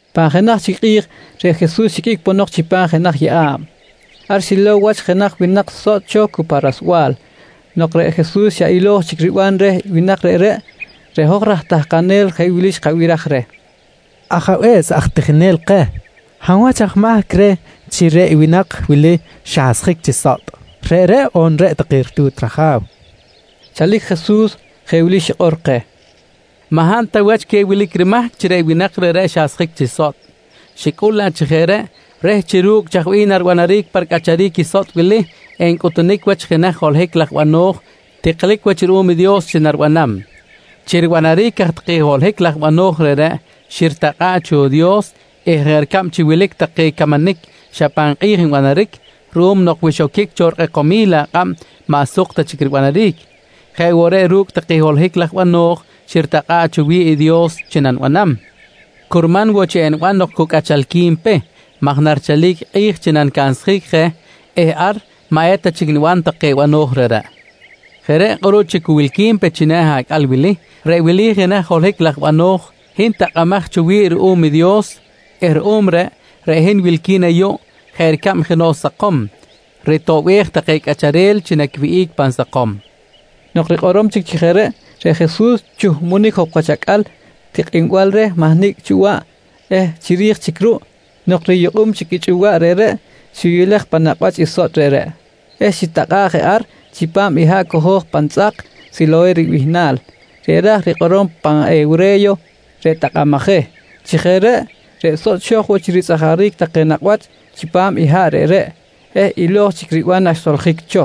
Pan jenaj chic kꞌi̱j reꞌ Jesus xiqꞌuic ponok chipam jenaj yeꞌa̱b. Ar xilow wach jenaj winak sotꞌ cho cu pa rasbal. Nok reꞌ Jesus xa ilo̱j chic riban reh winak reꞌreꞌ, reꞌ hoj raj tahkanel jeꞌ wili xkabiraj reh: «Ajabe̱s aj tijinel keh, hab wach aj mahc reh chi reꞌ winak wili xasjic chi sotꞌ, reꞌreꞌ on reꞌ take ritu̱t raja̱w? kojqui reh. Chalic Jesus jeꞌ wili xikꞌor keh: «Maꞌ hab ta wach queh wilic rimahc chi reꞌ winak reꞌreꞌ xasjic chi sotꞌ. Xicꞌul laꞌ chi jeꞌ reꞌ reh chi ru̱cꞌ chaj bih naribanaric pa ricꞌacharic i sotꞌ wili, encꞌutunic wach i jenaj holohic laj bano̱j tiklic wach ruꞌum i Dios chi naribanam. Chi ribanaric aj take holohic laj bano̱j reꞌreꞌ xiritakꞌa̱ꞌ cho i Dios eh jeꞌ ricab chi wilic take camanic xa pan kꞌi̱j nbanaric ruꞌum nok wi xoquic cho rikꞌekomil akꞌab maꞌ suk ta chic ribanaric, jeꞌ woꞌ reꞌ ru̱cꞌ take holohic laj bano̱j xiritakꞌa̱ꞌ cho wi̱ꞌ i Dios chi nanibanam, curman woꞌ chi eniban nok cu cꞌachalqui̱n pe maj narichalic kꞌi̱j chi nanicansjic je eh ar maꞌ eta chic niban take bano̱j reꞌreꞌ. Jeꞌ reꞌ kꞌuruꞌ chi cu wilqui̱n pe china̱ acꞌal wili, reꞌ wili i jenaj holohic laj bano̱j hin takꞌamaj cho wi̱ꞌ ruꞌum i Dios eh ruꞌum reꞌ, reꞌ hin wilqui̱n ayuꞌ jeꞌ ricab jenoꞌ sakom ritoꞌbej take cꞌacharel chi naquiwihꞌic pan sakom, nqui Jesus. Nok rikꞌorom chic chi jeꞌ reꞌ, reꞌ Jesus chuhbunic jok wach acꞌal tikꞌinbal reh mahnicꞌ chꞌuwaꞌ eh chiri̱j chic ruꞌ nok riyukꞌum chic i chꞌuwaꞌ reꞌreꞌ xiyulej pan nakꞌ wach i sotꞌ reꞌreꞌ eh xitakꞌa̱ꞌ je ar chipam i haꞌ cojo̱j pan tzꞌak “Siloheh” ribihnal reꞌ ra̱j rikꞌorom pan hewre̱yo “Reꞌ takꞌamaj je”. Chi jeꞌ reꞌ, reꞌ sotꞌ xo̱j woꞌ chi ritzꞌajaric take nakꞌ wach chipam i haꞌ reꞌreꞌ eh ilo̱j chic riban naxsoljic cho.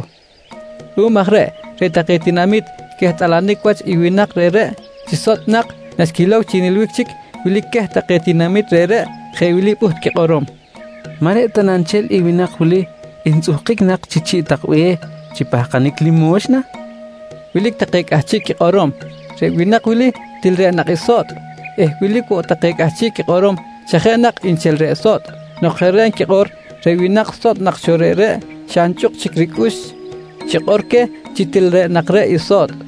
Ruꞌum aj reꞌ, reꞌ take tinamit quehtꞌalanic wach i winak reꞌreꞌ chi sotꞌ nak naxquilow chi nilbic chic, wilic queh take tinamit reꞌreꞌ jeꞌ wili pꞌuht quikꞌorom: «Maꞌ reꞌ ta na nchel i winak wili ntzꞌuhkic nak chi chi̱ꞌ tak be̱h chi pahkanic limo̱xna? nqui take. Wilic take cꞌahchiꞌ quikꞌorom, reꞌ winak wili til reꞌ nak i sotꞌ eh wilic woꞌ take cꞌahchiꞌ quikꞌorom xa jeꞌ nak nchel reꞌ sotꞌ. Nok jeꞌ reꞌ nquikꞌor, reꞌ winak sotꞌ nak cho reꞌreꞌ xa nchꞌuk chic ricꞌux xikꞌor queh chi til reꞌ nak cho i sotꞌ.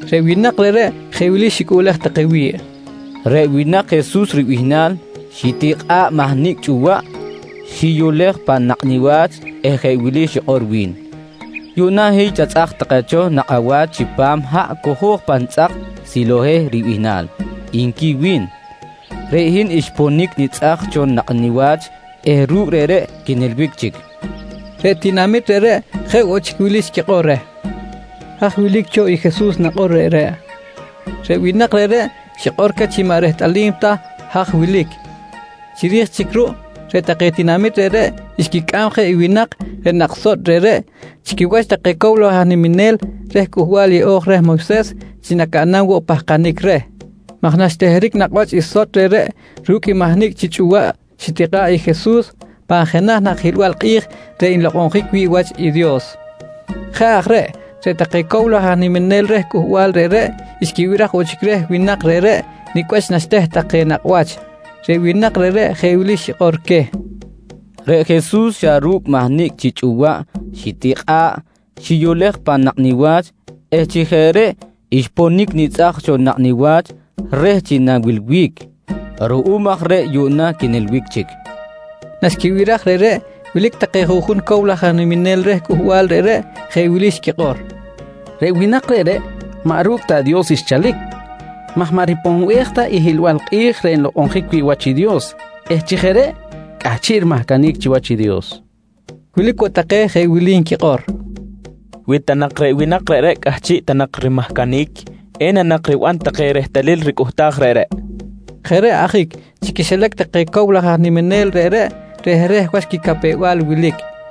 Reꞌ winak reꞌreꞌ jeꞌ wili xicꞌuꞌlej take wi̱ꞌ: «Reꞌ winak Jesus ribihnal xitikꞌa̱ꞌ mahnicꞌ chꞌuwaꞌ, xiyulej pan nakꞌ niwach eh jeꞌ wili xikꞌor wi̱n: ‹Yuꞌna hiy chatzꞌaj take cho nakꞌ awach chipam haꞌ cojo̱j pan tzꞌak Siloheh ribihnal, nqui wi̱n. «Reꞌ hin xponic nitzꞌaj cho nakꞌ niwach eh ru̱cꞌ reꞌreꞌ quinilbic chic, nqui queh. Reꞌ tinamit reꞌreꞌ jeꞌ woꞌ chic wili xquikꞌor reh: «Haj wilic cho i Jesus nakꞌor reꞌreꞌ, nqui take reh. Reꞌ winak reꞌreꞌ, xikꞌor queh chi maꞌ rehtꞌalim ta haj wilic. Chiri̱j chic ruꞌ, reꞌ take tinamit reꞌreꞌ xquicꞌam je i winak reꞌ nak sotꞌ reꞌreꞌ chi quiwach take cow laj aj niminel reh Cꞌuhbal Yeꞌo̱j reh Moyses chi nacaꞌnam woꞌ pahkanic reh maj naxteheric nakꞌ wach i sotꞌ reꞌreꞌ ru̱cꞌ i mahnicꞌ chi chꞌuwaꞌ xitikꞌa̱ꞌ i Jesus, pan jenaj nak hiꞌlbal kꞌi̱j reꞌ nlokꞌonjic wi̱ꞌ wach i Dios. Jeꞌ aj reꞌ, reꞌ take cow laj aj niminel reh cꞌuhbal reꞌreꞌ, xquibiraj woꞌ chic reh winak reꞌreꞌ nicꞌ wach naxteh take nakꞌ wach. Reꞌ winak reꞌreꞌ jeꞌ wili xikꞌor queh: «Reꞌ Jesus xa ru̱cꞌ mahnicꞌ chi chꞌuwaꞌ xitikꞌa̱ꞌ, xiyulej pan nakꞌ niwach eh chi jeꞌ reꞌ xponic nitzꞌaj cho nakꞌ niwach reh chi na̱wilbic. Ruꞌum aj reꞌ yuꞌna quinilbic chic, nqui queh. Naxquibiraj reꞌreꞌ wilic take juꞌjun cow laj aj niminel reh cꞌuhbal reꞌreꞌ, jeꞌ wili xquikꞌor: «Reꞌ winak reꞌreꞌ maꞌ ru̱cꞌ ta i Dios xchalic maj maꞌ riponbej ta i hiꞌlbal kꞌi̱j reꞌ nlokꞌonjic wi̱ꞌ wach i Dios eh chi jeꞌ reꞌ cꞌahchiꞌ rimahcanic chiwach i Dios, nqui take juꞌjun. Wilic woꞌ take jeꞌ wili nquikꞌor: «Wi ta nak reꞌ winak reꞌreꞌ cꞌahchiꞌ ta nak rimahcanic, ena nak riban take rehtalil ricꞌuhtaj reꞌreꞌ? nqui take. Jeꞌ reꞌ ajic chi quixilac take cow laj aj niminel reꞌreꞌ rehreh wach quicapew-bal wilic.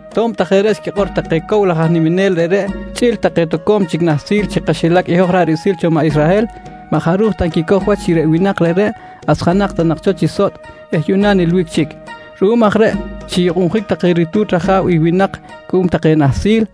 To̱b ta jeꞌ reꞌ xquikꞌor take cow laj aj niminel reꞌreꞌ chꞌi̱l take toco̱m chic nahsil chi kaxilac i hoj ra̱ꞌ riꞌsil cho maꞌ Israhel, maꞌ jaruj ta nquicoj wach chi reꞌ winak reꞌreꞌ asjanak ta nak cho chi sotꞌ eh yuꞌna nilbic chic. Ruꞌum aj reꞌ xiyukꞌunjic take ritu̱t raja̱w i winak cuꞌum take nahsil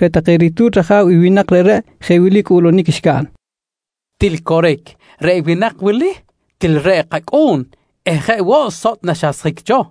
Reꞌ take ritu̱t raja̱w i winak reꞌreꞌ jeꞌ wili cꞌuꞌlunic xcaꞌn: «Til coric, reꞌ winak wili, til reꞌ i kacꞌu̱n eh jeꞌ woꞌ sotꞌ naxasjic cho.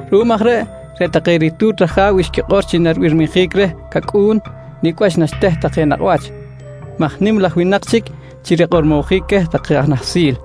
Ruꞌum aj reꞌ, reꞌ take ritu̱t raja̱w xquikꞌor chi naribirmijic reh cacꞌu̱n nicꞌ wach naxteh take nakꞌ wach maj nim laj winak chic chi rikꞌormojic queh take aj nahsil.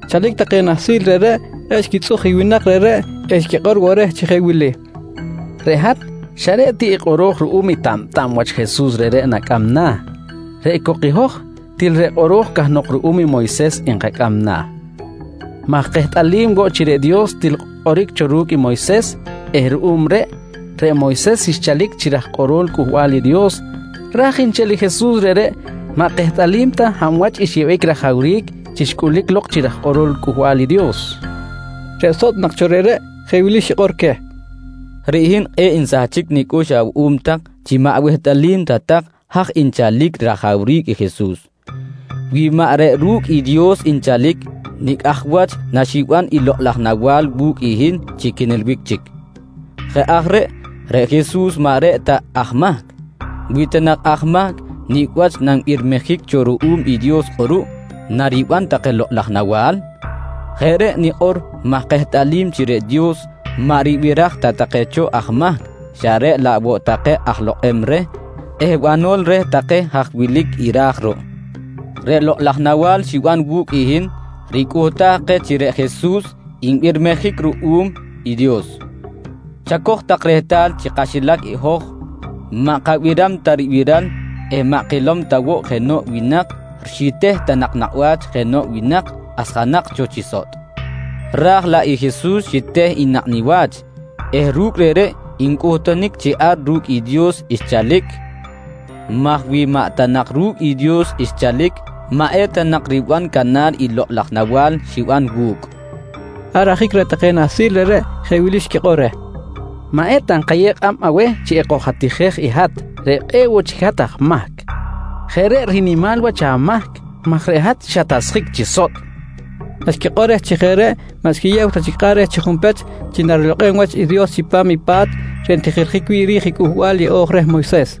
Chalic take nahsil reꞌreꞌ, kꞌe̱ꞌ xquitzꞌuj i winak reꞌreꞌ eh xquikꞌor woꞌ reh chi jeꞌ wili: «Reꞌ hat xa reꞌ ti i kꞌoro̱j ruꞌum i tabtab wach Jesus reꞌreꞌ nacꞌam na̱ reꞌ cok hoj til reꞌ kꞌoro̱j cahnok ruꞌum i Moyses nkacꞌam na̱ maj kehtꞌalim woꞌ chi reꞌ Dios til kꞌoric cho ru̱cꞌ i Moyses eh ruꞌum reꞌ, reꞌ Moyses xchalic chi raj kꞌorol Cꞌuhbal i Dios raj nchel i Jesus reꞌreꞌ, maꞌ kehtꞌalim ta hab wach xyeꞌbic rajawric chi xcꞌulic lok chi raj kꞌorol Cꞌuhbal i Dios, nqui take. Reꞌ sotꞌ nak cho reꞌreꞌ jeꞌ wili xikꞌor queh: «Reꞌ hin kꞌe̱ꞌ nsahchic nicꞌux awuꞌum tak chi maꞌ awehtꞌalim ta tak haj nchalic i rajawric i Jesus. Wi maꞌ reꞌ ru̱cꞌ i Dios nchalic, nicꞌ aj wach naxiban i lokꞌ laj nawa̱l wu̱cꞌ i hin chi quinilbic chic? Jeꞌ aj reꞌ, reꞌ Jesus maꞌ reꞌ ta aj mahc. Wi ta nak aj mahc, nicꞌ wach nanbirmijic cho ruꞌum i Dios kꞌuruꞌ nariban take lokꞌ laj nawa̱l? Jeꞌ reꞌ nikꞌor maj kehtꞌalim chi reꞌ Dios, maꞌ ribiraj ta take cho aj mahc xa reꞌ laꞌ woꞌ take aj lokꞌem reh eh banol reh take haj wilic i ra̱j ruꞌ. Reꞌ lokꞌ laj nawa̱l xiban wu̱cꞌ hin ricꞌuhtaj keh chi reꞌ Jesus nbirmijic ruꞌum i Dios. Chacoj tak rehtal chi kaxilac hoj maꞌ kabiram ta ribiral eh maꞌ kilom ta woꞌ jenoꞌ winak xiteh ta nak nakꞌ wach jenoꞌ winak asjanak cho chi sotꞌ, raj laꞌ i Jesus xiteh i nakꞌ niwach eh ru̱cꞌ reꞌreꞌ ncꞌutunic chi ar ru̱cꞌ i Dios xchalic maj wi maꞌ ta nak ru̱cꞌ i Dios xchalic maꞌ eta nak riban canar i lokꞌ laj nawa̱l xiban wu̱cꞌ, nqui xikꞌor queh. Ar ajic reꞌ take nahsil reꞌreꞌ jeꞌ wili xquikꞌor reh: «Maꞌeta nkayew kꞌab aweh chi ekojatijej i hat reꞌ kꞌe̱ꞌ woꞌ chic hat aj mahc. Jeꞌ reꞌ rinimal wach amahc maj reꞌ hat xatasjic chi sotꞌ, nqui take reh. Naxquikꞌor reh chi jeꞌ reꞌ maꞌ xquiyew ta chic kꞌab reh chi junpech chi narilokꞌem wach i Dios chipam i pa̱t reꞌ ntijiljic wi̱ꞌ ri̱j i Cꞌuhbal Yeꞌo̱j reh Moyses.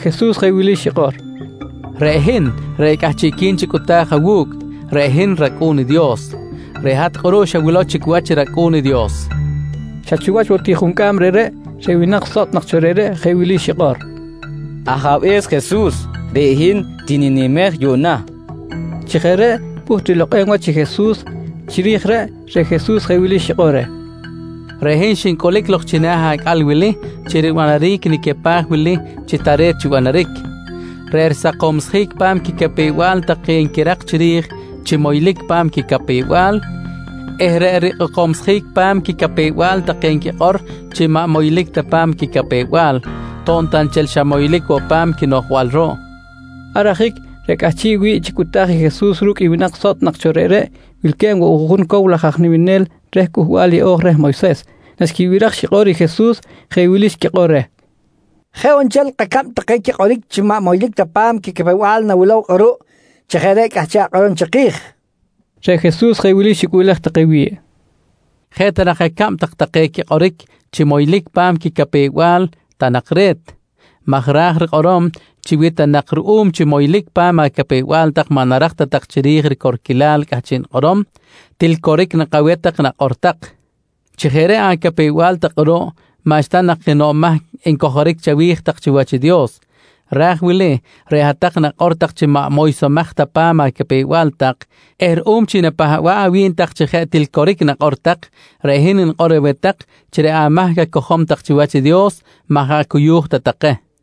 Reꞌ Jesus jeꞌ wili xikꞌor: «Reꞌ hin reꞌ cꞌahchiꞌqui̱n chi cꞌuta̱j awu̱cꞌ, reꞌ hin i rAcꞌu̱n i Dios. Reꞌ hat kꞌuruꞌ xawilow chic wach i rAcꞌu̱n i Dios, nqui Jesus. Xa chiwach woꞌ ti juncꞌam reꞌreꞌ, reꞌ winak sotꞌ nak cho reꞌreꞌ jeꞌ wili xikꞌor: «Ajabe̱s Jesus, reꞌ hin tininimej yuꞌna, nqui xikꞌor reh. Chi jeꞌ reꞌ pꞌuht rilokꞌem wach i Jesus. Chiri̱j reꞌ, reꞌ Jesus jeꞌ wili xikꞌor: «Reꞌ hin xincꞌulic lok china̱ acꞌal wili chi ribanaric i nicapaj wili chi tare̱t chi banaric: Reꞌ risakomsjic pa̱m quicapew-bal take nquirak chiri̱j chi moylic pa̱m quicapew-bal eh reꞌ rikꞌekomsjic pa̱m quicapew-bal take nquikꞌor chi maꞌ moylic ta pa̱m quicapew-bal to̱b ta nchel xa moylic woꞌ pa̱m quinoꞌjbal ruꞌ, nqui Jesus. Ar ajic reꞌ cꞌahchiꞌ wi̱ꞌ chi cꞌuta̱j i Jesus ru̱cꞌ i winak sotꞌ nak cho reꞌreꞌ, wilque̱b woꞌ juꞌjun cow laj aj niminel reh Cꞌuhbal Yeꞌo̱j reh Moyses. Naxquibiraj xikꞌor i Jesus, jeꞌ wili xquikꞌor reh: «Jeꞌ on nchel kacab take quikꞌoric chi maꞌ moylic ta pa̱m quicapew-bal nawilow kꞌuruꞌ chi jeꞌ reꞌ cꞌahchiꞌ akꞌorom chiki̱j, nqui take reh. Reꞌ Jesus jeꞌ wili xicꞌuꞌlej take wi̱ꞌ: «Jeꞌ ta nak acab tak take quikꞌoric chi moylic pa̱m quicapew-bal ta nak re̱t, maj raj nak rikꞌorom chi wi ta nak ruꞌum chi moylic pa̱m acapew-bal tak maꞌ narak ta tak chiri̱j ricorquilal cꞌahchiꞌ nikꞌorom, til coric nak aweh tak i nakꞌor tak. Chi jeꞌ reꞌ acapew-bal tak kꞌuruꞌ maꞌxta nak jenoꞌ mahc encojoric chawi̱j tak chiwach i Dios. Raj wili reꞌ hat-tak nakꞌor tak chi maꞌ moysomaj ta pa̱m acapew-bal tak eh ruꞌum chi napahba̱ꞌ awi̱b tak chi jeꞌ til coric nakꞌor tak, reꞌ hin nikꞌor aweh tak chi reꞌ amahc acojom tak chiwach Dios, maꞌ jaꞌ cuyu̱j ta take, nqui Jesus.